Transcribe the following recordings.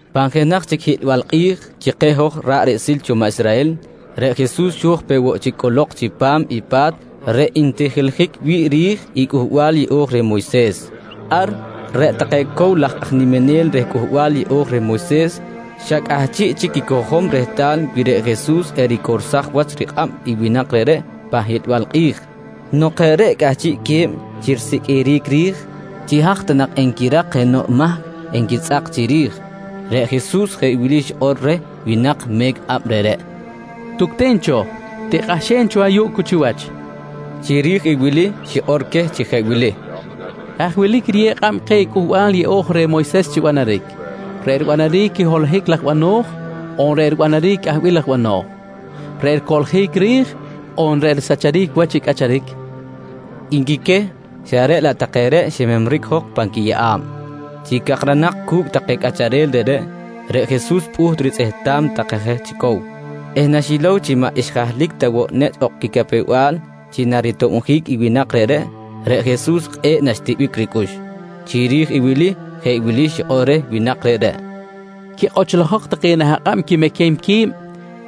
Pan jenaj chic hiꞌlbal kꞌi̱j chi keh hoj ra̱ꞌ riꞌsil cho maꞌ Israhel, reꞌ Jesus xo̱j peꞌ woꞌ chic cꞌolok chipam i pa̱t reꞌ ntijiljic wi̱ꞌ ri̱j i Cꞌuhbal Yeꞌo̱j reh Moyses. Ar reꞌ take cow laj aj niminel reh Cꞌuhbal Yeꞌo̱j reh Moyses xa cꞌahchiꞌ chic quicojom rehtal wi reꞌ Jesus ericorsaj wach rikꞌab i winak reꞌreꞌ pan hiꞌlbal kꞌi̱j. Nok jeꞌ reꞌ cꞌahchiꞌque̱b chi risiqꞌuiric ri̱j chi haj ta nak enquirak jenoꞌ mahc enquitzꞌak chiri̱j, reꞌ Jesus jeꞌ wili xikꞌor reh winak me̱c kꞌab reꞌreꞌ: «Tucten cho, tikꞌahxen cho ayuꞌ cu chiwach, nqui reh. Chiri̱j i wili xikꞌor queh chi jeꞌ wili: «Haj wilic riyew kꞌab keh i Cꞌuhbal Yeꞌo̱j reh Moyses chi banaric, reꞌ ribanaric i holohic laj bano̱j on reꞌ ribanaric i cꞌahbil laj bano̱j. Reꞌ ricoꞌljic ri̱j on reꞌ risacharic wach i cꞌacharic? nqui queh, xa reꞌ laꞌ take reꞌ ximemric jok pan quiyeꞌa̱b. Chi cakranak cu̱cꞌ take cꞌacharel reꞌreꞌ, reꞌ Jesus pꞌuht ritzꞌehtam take je chi cow eh naxilow chi maꞌ xjahlic ta woꞌ nechꞌ ok quicapew-bal chi naritobjic i winak reꞌreꞌ, reꞌ Jesus kꞌe̱ꞌ naxtiꞌbic ricꞌux. Chiri̱j i wili jeꞌ wili xikꞌor reh winak reꞌreꞌ: «Quikꞌochlojok take nah akꞌab quimequem qui̱b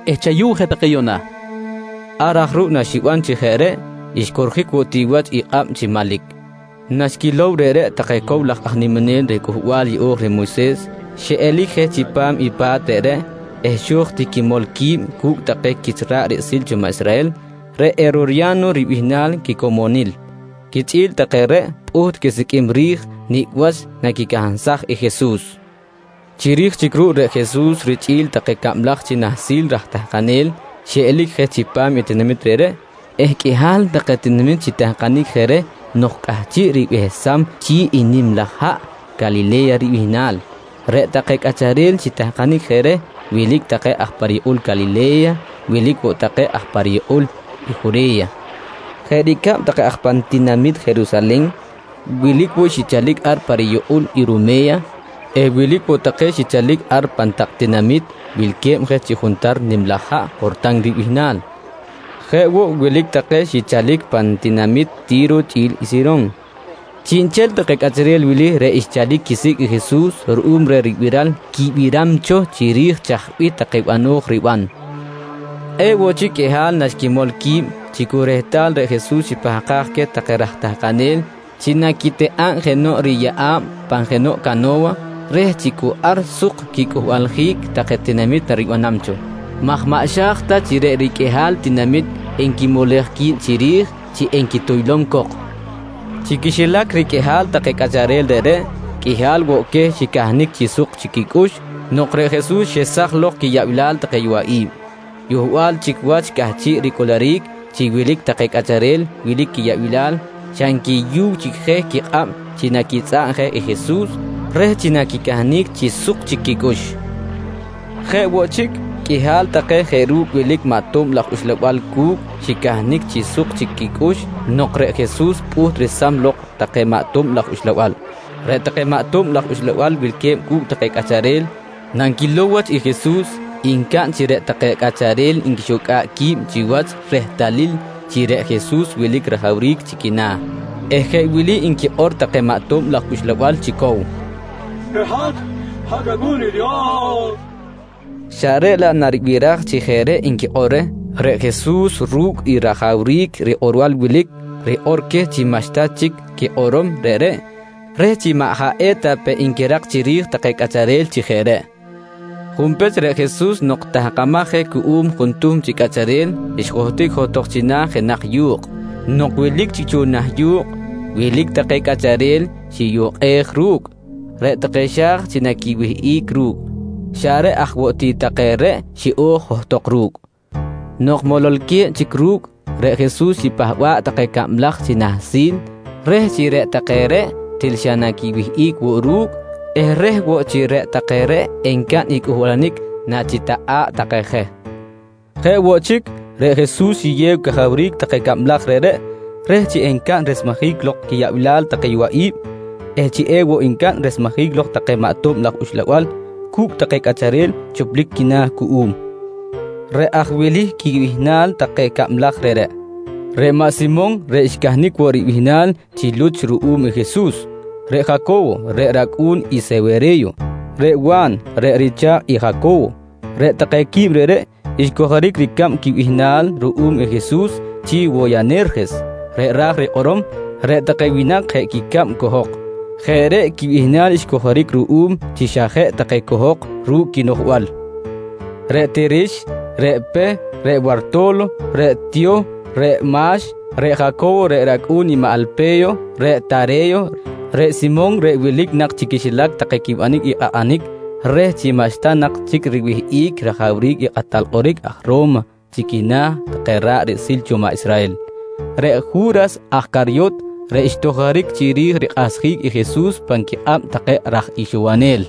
eh chayu̱w je take yuꞌna, nqui reh. Ar aj ruꞌ naxiban chi jeꞌ reꞌ, xcorjic woꞌ ti wach i kꞌab chi manlic. Naxquilow reꞌreꞌ take cow laj aj niminel reh Cꞌuhbal Yeꞌo̱j reh Moyses, xiꞌelic je chipam i pa̱t reꞌreꞌ eh xo̱j ti quimol qui̱b cu̱cꞌ take quich ra̱ꞌ riꞌsil cho maꞌ Israhel reꞌ Herorya̱no ribihnal quicomonil. Quichꞌi̱l take reꞌ pꞌuht quisiqꞌuim ri̱j nicꞌ wach naquicansaj i Jesus. Chiri̱j chic ruꞌ reꞌ Jesus richꞌi̱l take cablaj chi nahsil raj tahkanel xiꞌelic je chipam i tinamit reꞌreꞌ eh qꞌuihal take tinamit xitahkanic je reh nok cꞌahchiꞌ ribehsam chi̱ꞌ i nim laj haꞌ Calile̱ya ribihnal. Reꞌ take cꞌacharel xitahkanic je reh wilic take aj pa riyukꞌul Calile̱ya, wilic woꞌ take aj pa riyukꞌul i Jure̱ya jeꞌ ricab take aj pan tinamit Jerusalen. Wilic woꞌ xichalic ar pa riyukꞌul Irume̱ya eh wilic woꞌ take xichalic ar pan tak tinamit wilque̱b je chi juntar nim laj haꞌ Jortan ribihnal. Jeꞌ woꞌ, wilic take xichalic pan tinamit Ti̱ro chꞌi̱l i Siron. Chiꞌnchel take cꞌacharel wili reꞌ xchalic quisicꞌ i Jesus ruꞌum reh ribiral quibiram cho chiri̱j chaj bih take bano̱j riban, kꞌe̱ꞌ woꞌ chic qꞌuihal naxquimol qui̱b chi cu rehtal reꞌ Jesus xipahkaj queh take raj tahkanel chi naquitikꞌa̱b jenoꞌ riyeꞌa̱b pan jenoꞌ cano̱wa reh chi cu ar suk quicꞌuhbaljic take tinamit naribanam cho, maj maꞌ xa̱j ta chi reꞌ riqꞌuihal tinamit xquimulej qui̱b chiri̱j enquituylom cok. Chi quixilac riqꞌuihal take cꞌacharel reꞌreꞌ, qꞌuihal woꞌ queh xicahnic chi suk chic quicꞌux nok reꞌ Jesus xesaj lok quiyaꞌbilal take yowaꞌi̱b. Yohbal woꞌ chic wach cꞌahchiꞌ ricꞌuluric chi wilic take cꞌacharel wilic quiyaꞌbilal xa nquiyuw chic je quikꞌab chi naquitzꞌa̱b je i Jesus reh chi naquicahnic chi suk chic quicꞌux. Jeꞌ woꞌ chic, qꞌuihal take jeꞌ ru̱cꞌ wilic maꞌ tob laj uxlabal cu̱cꞌ xicahnic chi suk chic quicꞌux nok reꞌ Jesus pꞌuht resam lok take maꞌ tob laj uxlabal. Reꞌ take maꞌ ato̱b laj uxlabal wilque̱b cu̱cꞌ take cꞌacharel, nanquilow wach i Jesus, ncaꞌn chi reꞌ take cꞌacharel nquixucꞌa̱ꞌ qui̱b chiwach rehtalil chi reꞌ Jesus wilic rajawric chi quina̱ eh jeꞌ wili nquikꞌor take maꞌ tob laj uxlabal chi cow: «Reꞌ hat, hat rAcꞌu̱n i Dios, nqui take. Xa reꞌ laꞌ naribiraj chi jeꞌ reꞌ nquikꞌor reh, reꞌ Jesus ru̱cꞌ i rajawric rikꞌorbal wilic, rikꞌor queh chi maꞌxta chic quikꞌorom reꞌreꞌ reh chi maꞌ jaꞌ eta pe nquirak chiri̱j take cꞌacharel chi jeꞌ reꞌ. Junpech, reꞌ Jesus nok tahkamaj je cuꞌum juntuhm chi cꞌacharel xjohtic johtok china̱ jenaj yu̱kꞌ. Nok wilic chic cho nah yu̱kꞌ, wilic take cꞌacharel xiyukꞌej ru̱cꞌ, reꞌ take xa̱j chi naquiwihꞌic ru̱cꞌ. Xa reꞌ aj woꞌ ti take reꞌ xiꞌo̱j johtok ru̱cꞌ. Nok mololque̱b chic ru̱cꞌ, reꞌ Jesus xipahba̱ꞌ take cablaj chi nahsil reh chi reꞌ take reꞌ til xa naquiwihꞌic woꞌ ru̱cꞌ eh reh woꞌ chi reꞌ take reꞌ encaꞌn i cꞌuhbalanic nachitakꞌa̱ꞌ take je. Jeꞌ woꞌ chic reꞌ Jesus xiyew cajawric take cablaj reꞌreꞌ reh chi encaꞌn resmejic lok quiyaꞌbilal take yowaꞌi̱b eh chi ewoꞌ ncaꞌn resmejic lok take maꞌ tob laj uxlabal cu̱cꞌ take cꞌacharel choplic quina̱ cuꞌum. Reꞌ aj wili quibihnal take cablaj reꞌreꞌ: Reꞌ maꞌ Simon reꞌ xcahnic woꞌ ribihnal chi Luch ruꞌum i Jesus. Reꞌ Jaco̱wo reꞌ racꞌu̱n i Sewere̱yo. Reꞌ Wa̱n, reꞌ richa̱kꞌ i Jaco̱wo. Reꞌ take quib reꞌreꞌ, xcojoric ricab quibihnal ruꞌum i Jesus chi “Woyanerjes”, reꞌ ra̱j rikꞌorom: “Reꞌ take winak jeꞌ quicab cohok”. Jeꞌ reꞌ quibihnal xcojoric ruꞌum chi xa jeꞌ take cohok ru̱cꞌ quinoꞌjbal. Reꞌ Tirix, reꞌ Peh, reꞌ Warto̱lo, reꞌ Tiyoh, reꞌ Ma̱x, reꞌ Jaco̱wo reꞌ racꞌu̱n i maꞌ Alpe̱yo, reꞌ Tare̱yo, reꞌ Simon reꞌ wilic nak chi quixilac take quibanic i kꞌakꞌanic reh chi maꞌxta nak chic riwihꞌic rajawric i kꞌatal kꞌoric aj Ro̱ma chi quina̱ take ra̱ꞌ riꞌsil cho maꞌ Israhel. Reꞌ Ju̱ras aj Caryot, reꞌ xtojoric chiri̱j rikꞌahsjic i Jesus pan quikꞌab take raj ixowonel.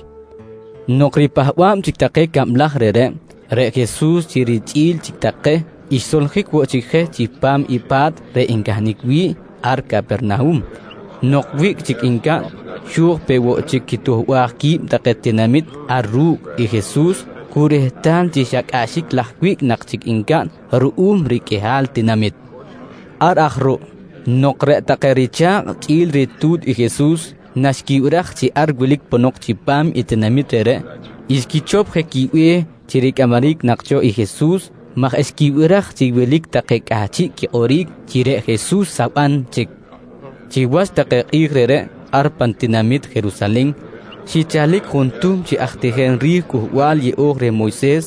Nok ripahba̱b chic take cablaj reꞌreꞌ, reꞌ Jesus chi richꞌi̱l chic take, xsoljic woꞌ chic je chipam i pa̱t reꞌ ncahnic wi̱ꞌ ar Capernahum. Nok wiꞌc chic ncaꞌn, xo̱j peꞌ woꞌ chic quituhbaj qui̱b take tinamit ar ru̱cꞌ i Jesus cu rehtal chi xa cꞌaxic laj wiꞌc nak chic ncaꞌn ruꞌum riqꞌuihal tinamit! Ar aj ruꞌ nok reꞌ take richa̱kꞌ chꞌi̱l ritu̱t i Jesus naxquibiraj chi ar wilic ponok chipam i tinamit reꞌreꞌ, xquichop je quibe̱h chi ricꞌamaric nak cho i Jesus maj xquibiraj chi wilic take cꞌahchiꞌ quikꞌoric chi reꞌ Jesus saban chic. Chiwach take kꞌi̱j reꞌreꞌ, ar pan tinamit Jerusalen xichalic juntuhm chi aj tijem ri̱j Cꞌuhbal Yeꞌo̱j reh Moyses.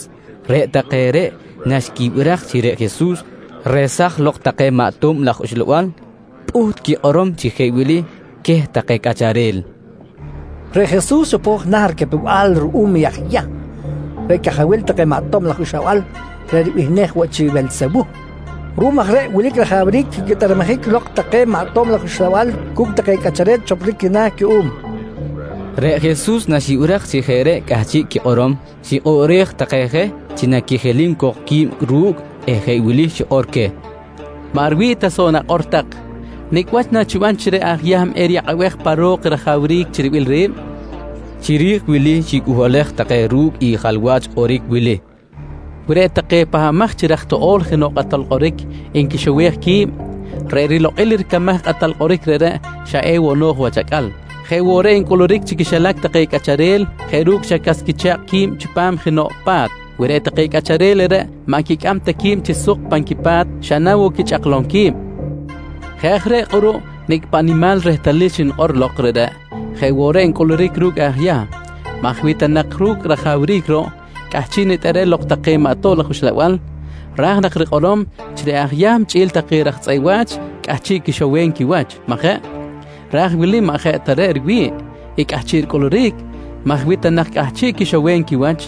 Reꞌ take reꞌ naxquibiraj chi reꞌ Jesus resaj lok take maꞌ tob laj uxlabal, pꞌuht quikꞌorom chi jeꞌ wili queh take cꞌacharel: «Reꞌ Jesus chopo̱j na̱ ricapew-bal ruꞌum i aj Yahm reꞌ cajawil take maꞌ tob laj uxlabal reꞌ ribihnej woꞌ chi Welsewuh. Ruꞌum aj reꞌ wilic rajawric chi quitꞌermejic lok take maꞌ tob laj uxlabal cu̱cꞌ take cꞌacharel choplic quina̱ cuꞌum, nqui take. Reꞌ Jesus naxibiraj chi jeꞌ reꞌ cꞌahchiꞌ quikꞌorom xikꞌoꞌrej take je chi naquijilim cok qui̱b ru̱cꞌ eh jeꞌ wili xikꞌor queh: «Maꞌ riwi̱ꞌ ta soꞌ i nakꞌor tak. Nicꞌ wach nachiban chi reꞌ aj Yahm eriyakꞌabej pa ro̱k i rajawric chi ribil ri̱b? nqui queh. Chiri̱j wili xicꞌuhbalej take ru̱cꞌ i jalwach kꞌoric wili: «Wi reꞌ take pahbamaj chi raj toꞌo̱l jenoꞌ kꞌatal kꞌoric nquixowej qui̱b, reꞌ rilokꞌil ricamaj i kꞌatal kꞌoric reꞌreꞌ, xa ewoꞌ no̱j wach acꞌal. Jeꞌ woꞌ reꞌ ncꞌuluric chi quixilac take cꞌacharel jeꞌ ru̱cꞌ xa cas quicha̱kꞌ qui̱b chipam jenoꞌ pa̱t. Wi reꞌ take cꞌacharel reꞌreꞌ maꞌ nquicꞌam ta qui̱b chi suk pan quipa̱t, xa na woꞌ quichꞌaklom qui̱b. Jeꞌ aj reꞌ kꞌuruꞌ nicꞌ paꞌ nimal i rehtalil xnikꞌor lok reꞌreꞌ jeꞌ woꞌ reꞌ ncꞌuluric ru̱cꞌ aj Yahm maj wi ta nak ru̱cꞌ reꞌ rajawric ruꞌ cꞌahchiꞌ nitꞌerem lok take maꞌ tob laj uxlabal, ra̱j nak rikꞌorom chi reꞌ aj Yahm chꞌi̱l take raj tzꞌeꞌ wa̱ch cꞌahchiꞌ quixowem quiwach, majeꞌ? Raj i wili maꞌ jeꞌ ta reꞌ riwi̱ꞌ i cꞌahchiꞌ ricꞌuluric maj wi ta nak cꞌahchiꞌ quixowem quiwach,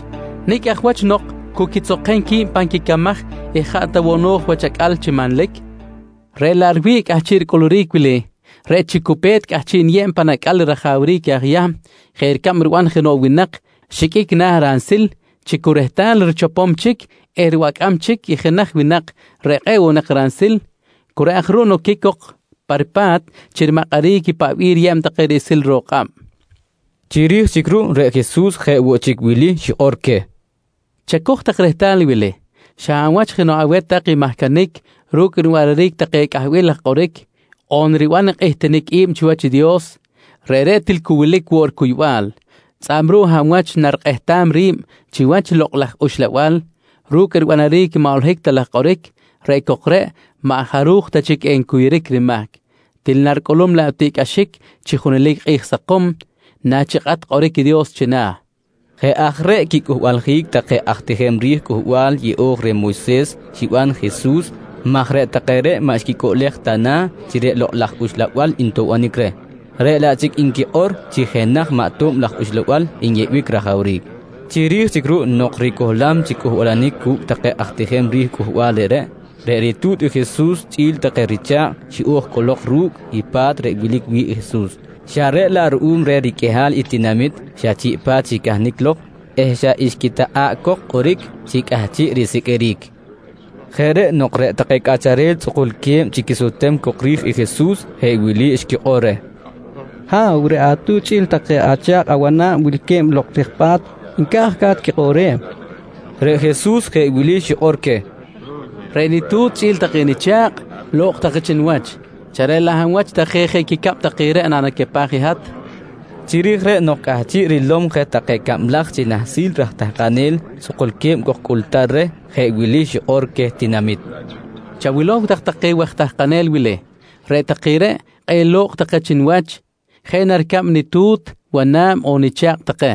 nicꞌ aj wach nok cu quitzokem qui̱b pan quicamaj eh jaꞌ ta woꞌ no̱j wach acꞌal chi manlic. Reꞌ laꞌ riwi̱ꞌ i cꞌahchiꞌ ricꞌuluric wili reꞌ chi cu pe̱t cꞌahchiꞌ niyeb pan acꞌal i rajawric aj Yahm jeꞌ ricab riban jenoꞌ winak xiqꞌuic na̱ ransil chi cu rehtal richopom chic eh ribacꞌam chic i jenaj winak reꞌ kꞌe̱ꞌ woꞌ nak ransil, cu reꞌ aj ruꞌ noquic cok pa ripa̱t chi rimakꞌaric i paꞌ bih riyeb take chi riꞌsil ro̱k kꞌab, nqui queh. Chiri̱j chic ruꞌ, reꞌ Jesus jeꞌ woꞌ chic wili xikꞌor queh: «Chacoj rehtal i wili: Xa hab wach jenoꞌ aweh tak nmahcanic ru̱cꞌ ribanaric take cꞌahbil laj kꞌoric on riban i kꞌihtinic i̱b chiwach i Dios, reꞌreꞌ til cu wilic woꞌ ricuybal. Tzꞌa̱b ruꞌ hab wach narikꞌehtam ri̱b chiwach i Lokꞌ laj Uxlabal ru̱cꞌ ribanaric maꞌ holohic ta laj kꞌoric, reꞌ cok reꞌ maꞌ jaruj ta chic encuyuric rimahc, til naricꞌulum laꞌ tiꞌcꞌaxic chi junelic kꞌi̱j sakom nachikꞌat kꞌoric i Dios china̱, nqui Jesus. Jeꞌ aj reꞌ quicꞌuhbaljic take aj tijem ri̱j Cꞌuhbal Yeꞌo̱j reh Moyses xiban i Jesus maj reꞌ take reꞌ maꞌ xquicꞌuꞌlej ta na̱ chi reꞌ Lokꞌ laj Uxlabal ntoꞌbonic reh, reꞌ laꞌ chic nquikꞌor chi jenaj maꞌ tob laj uxlabal nyeꞌbic rajawric. Chiri̱j chic ruꞌ nok ricohlam chic cꞌuhbalanic cu̱cꞌ take aj tijem ri̱j cꞌuhbal reꞌreꞌ, reꞌ ritu̱t i Jesus chꞌi̱l take richa̱kꞌ xiꞌo̱j cꞌolok ru̱cꞌ i pa̱t reꞌ wilic wi̱ꞌ Jesus, xa reꞌ laꞌ ruꞌum reh riqꞌuihal i tinamit xa chiꞌ pa̱t xicahnic lok eh xa xquitakꞌa̱ꞌ cok kꞌoric chi cꞌahchiꞌ risiqꞌuiric. Jeꞌ reꞌ nok reꞌ take cꞌacharel tzꞌukulque̱b chi quisutem cok ri̱j i Jesus jeꞌ wili xquikꞌor reh: «Ha̱w, reꞌ atu̱t chꞌi̱l take acha̱kꞌ awana̱b wilque̱b lok rij pa̱t, nca̱j ca̱t quikꞌoꞌrem, nqui take cok reh. Reꞌ Jesus jeꞌ wili xikꞌor queh: «Reꞌ nitu̱t chꞌi̱l take nicha̱kꞌ, lo̱kꞌ take chi niwach xa reꞌ laꞌ hab wach take jeꞌ quicab take reꞌ nanacapaj i hat? nqui reh. Chiri̱j reꞌ nok cꞌahchiꞌ rilom je take cablaj chi nahsil raj tahkanel tzꞌukulque̱b cok cꞌultar reh, jeꞌ wili xikꞌor queh tinamit: «Chawilow tak take waj tahkanel wili. Reꞌ take reꞌ, kꞌe̱ꞌ lo̱kꞌ take chi niwach jeꞌ na ricab nitu̱t wana̱b on nicha̱kꞌ take.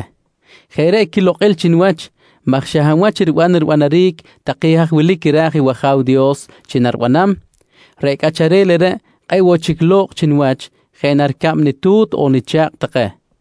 Jeꞌ reꞌ quilokꞌil chi niwach maj xa hab wach riban ribanaric take haj wilic ra̱j i wAja̱w Dios chi naribanam, reꞌ cꞌacharel reꞌreꞌ kꞌe̱ꞌ woꞌ chic lo̱kꞌ chi niwach jeꞌ na ricab nitu̱t on nicha̱kꞌ take, nqui Jesus.